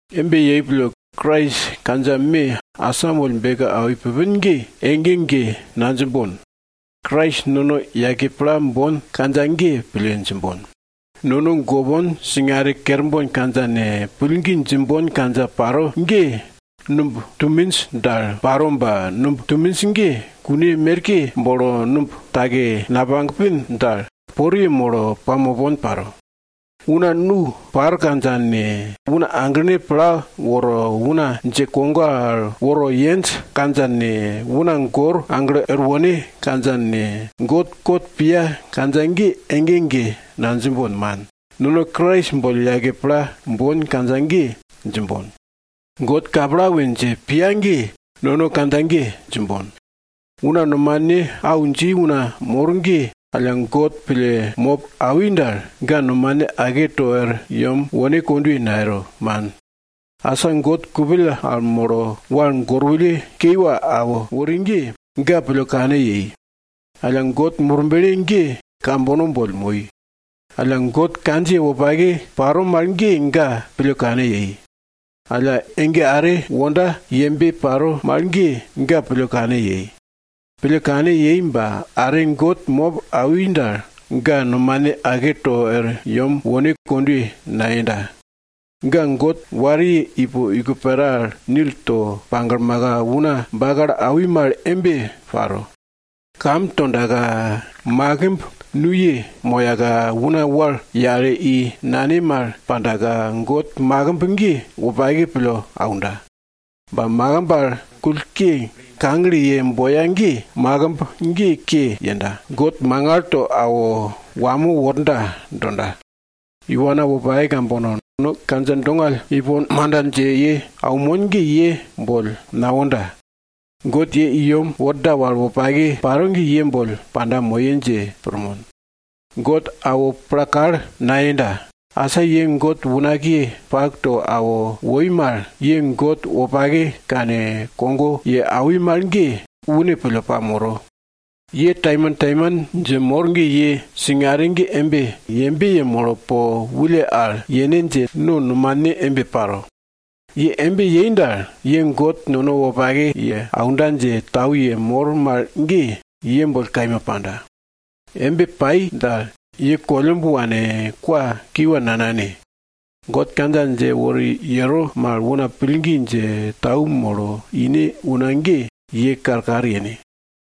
Embe yei pille, Krais kandja me asamoll beke awi pupin ge, ege ege nadjimbon. Krais nono yake pla bon kandja ge pille djimbon. Nono gopon singare kerbon kandja ne, pillgi djimbon kandja paro ge, numb tuminj dal paro ba numb tuminj ge kun merke bolo numb take napagpin dal poriye molo pamopon paro. Una nu par kandja ne, una aglene pla woro una dje kogo al woro yenj kandja ne, una gor aglo er wone kandja ne, God kot piya kandja ge ege ege nadjimbon, man. Nono Krais boll yake pla bon kandja ge djimbon. God kapla we dje piya ge, nono kandja ge djimbon. Una nomane au dji una mor ge, alla God pille mop awi dal, ga nomane ake to er yem wone kondwe nayero, man. Asa God kupill al molo wal gorwulle kiwa awo wori ge, ga pille kane yei. Alla, God Murble ge kambono boll moi. Alla, God kandjiye wopake paro mal ge, ga pille kane yei. Alla, ege are wonda yembe paro mal ge, ga pille kane yei. Pille kane yei ba are God mop awi dal, ga nomane ake to er yem wone kondwe nayenda. Ga God wariye ipo iko pera al nil to paglmaka una bakalo awi mal embe paro. Kam tondaka, makimb nuye moyaka, una wal yale i nane mal pandaka, God makimb ge wopake pille aunda. Ba makimb al kull ke kagle yei boya ge, makimb ge ke yenda, God mangal to awo wamo worda donda. Iwana wopake kambono, no kandja dongall ipon manda dje ye aunmon ge ye boll nawonda. God ye i yem worda wal wopake paro ge ye boll panda moye dje pirmon. God awo pla kal nayenda, asa ye God unakiye pak to awo woi mal, ye God wopake kane, kogo ye awi mal ge, une pille pamoro. Ye taimantaiman dje mor ge ye singare ge yembe yemolo po wulle al yene dje no nomane embe paro. Ye embe yei dal, ye God nono wopake ye aunda dje tau yemor mal ge, ye boll kaima panda. Embe pai dal, ye kollumb wane kwa kiwa nanane. God kandja dje wori yero mal, una pillgi dje, tau molo ine una ge, ye karkar yene.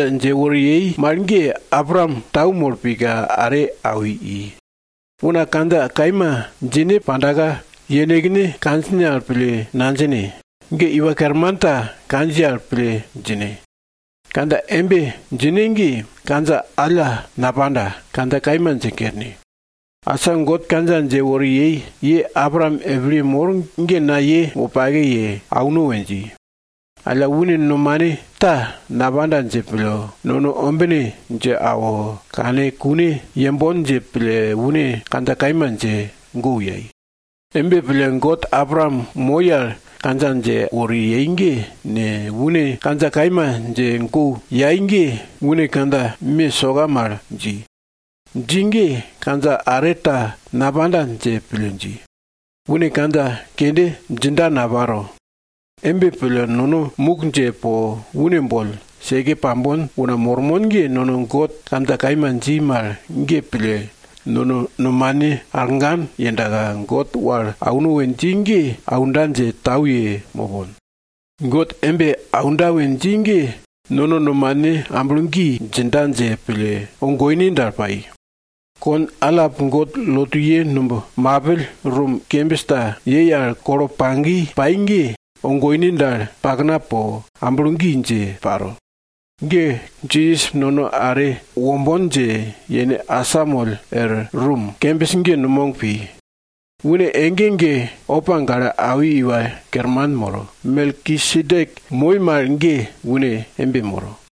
Kandja dje wori yei mal ge, Abraam tau molo pika are awi i. Una kandja kaima djine pandaka, yenekne kandjine al pille nadjine. Ge iwa kerman ta kandjiye al pille djine. Kandja embe djine ge, kandja alla napanda, kandja kaima dje kerne. Asa God kandja dje wori yei, ye Abraam epilye mor ge na ye wopake ye auno we dji. Alla une nomane ta napanda dje pille nono ombine dje awo, kane kune yembon dje pille une kandja kaima dje gu yai. Embe pille, God Abraam moi al kandja dje wori yei ge ne, une kandja kaima dje gu yai ge, une kandja me soka mal dji. Dji ge kandja are ta napanda dje pille dji. Une kandja kende djinda naparo. Embe pille nono muk dje po une boll seke pambon una mormon ge, nono God kandja kaima dji mal ge pille nono nomane arngan yendaka, God wal auno we dji ge aunda dje tau ye mopon. God embe aunda we dji ge, nono nomane amblo gi djinda dje pille, ogoine dal paro. Kon allap God lotuye numb mapill rum kembis ta yei al kolo pagi pai ge, ogoine dal pakna po amblo gi dje paro. Ge Jisas nono are wombon dje yene asamoll er rum kembis ge numog pi. Une ege ege opa gale awi iwa kerman moro, Melkisedek moi mal ge une embe moro.